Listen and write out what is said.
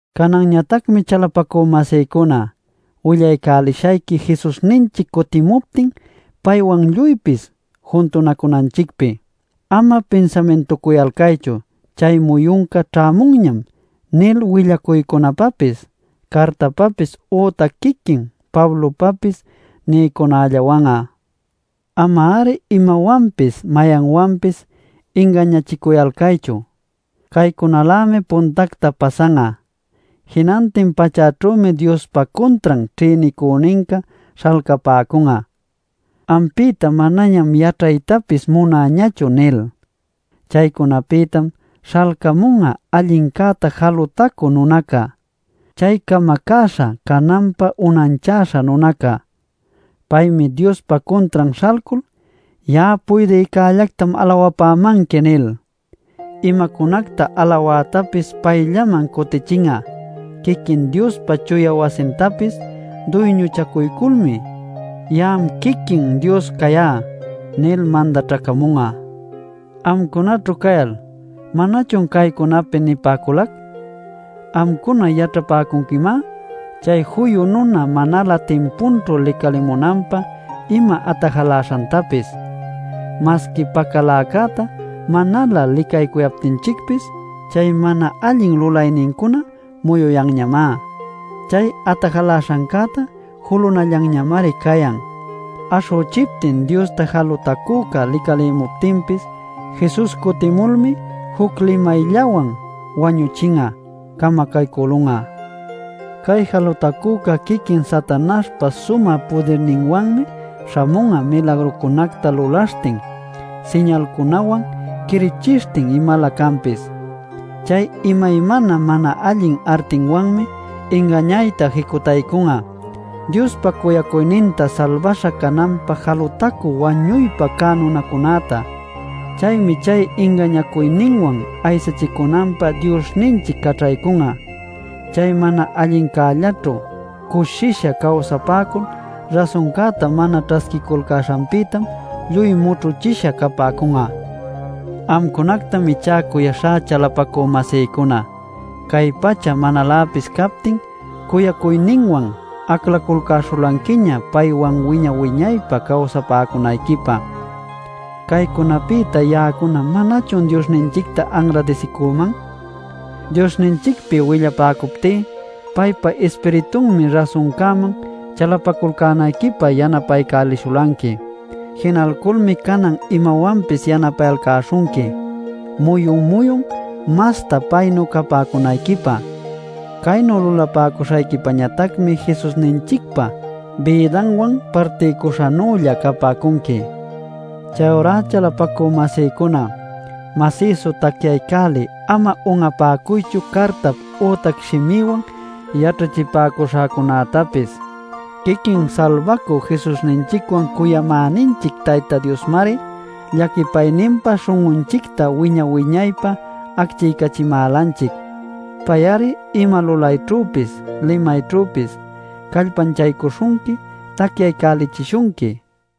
Cananñatacmi chalapacü-masïcuna, willaycälishayqui Jesusninchic cutimuptin paywan lluypis juntunacunanchicpi. Ama pinsamintucuyalcaychu “Chay muyunca ćhämunñam” nil willacuycunapapis, cartapapis ütac quiquin Pablopapis nïcunällawan'a. Ama-ari imawanpis mayanwanpis ingañachicuyalcaychu. Caycunalämi puntacta pasan'a: jinantin pachäćhümi Diospa cuntran ćhïnicüninca śhalcapäcun'a “Ampïta manañam yaćhaytapis munäñachu” nil. Chaycunapïtam śhalcamun'a allincäta jalutacü nunaca, chay camacäśha cananpä unanchäśha nunaca. Paymi Diospa cuntran śhalcul “Ya'a puydïcällactam alawapämanqui” nil imacunacta alawätapis payllaman cutichin'a. Quiquin Diospa chuya wasintapis duyñuchacuyculmi “Ya'am quiquin Dios cayá” nil mandaćhacamun'a. Amcunaćhu cayal ¿manachun caycunapi nipäculac? Amcuna yaćhapäcunquimá chay juyu nuna manalä timpunćhu licalimunanpä ima atajaläśhantapis. Masqui pacaläcäta manalä licaycuyaptinchicpis chay mana allin lulaynincuná muyuyanñamá. Chay atajaläśhancäta julünallanñamari cayan. Aśhüchiptin Diosta jalutacüca licalimuptinpis Jesus cutimulmi juc limayllawan wañüchin'a, camacaycülun'a. Cay jalutacüca quiquin Satanaśhpa sumä pudirninwanmi śhamun'a milagrucunacta lulaśhtin siñalcunawan quirichishtin imalä canpis. Chay imaymana mana allin artinwanmi ingañayta jicutaycun'a, Diospa cuyacuyninta salbaśha cananpä jalutacü wañuypä cä nunacunäta. Chaymi chay ingañacuyninwan aysachicunanpä Diosninchic caćhaycun'a. Chay mana allincällaćhu cushisha cawsapäcul rasuncäta mana ćhasquiculcäśhanpïtam lluy mućhuchisha capäcun'a. Amcunactam ichá cuyaśhá chalapacü-masïcuna cay pacha manaläpis captin cuyacuyninwan aclaculcäśhulanquiña paywan wiña-wiñaypä cawsapäcunayquipä. Caycunapïta, ya'acuna ¿manachun Diosninchicta anradisicüman? Diosninchicpi willapäcuptí paypa Ispiritunmi rasuncäman chalapaculcänayquipä yanapaycälishulanqui. Jinalculmi canan imawanpis yanapayalcäśhunqui muyun-muyun masta paynu capäcunayquipä. Caynu lulapäcuśhayquipañatacmi Jesusninchicpa bïdanwan partiycuśhanülla capäcunqui. Chayurá chalapacü-masïcuna masïsu tacyaycälil ama un'apäcuychu cartap ütac shimïwan yaćhachipäcuśhäcunätapis. Quiquin Salbacü Jesusninchicwan cuyamäninchic Tayta Diosmari llaquipayninpa śhun'unchicta wiña-wiñaypä acchiycachimälanchic. Pay-ari ima lulayćhüpis limayćhüpis callpanchaycuśhunqui tacyaycälichishunqui.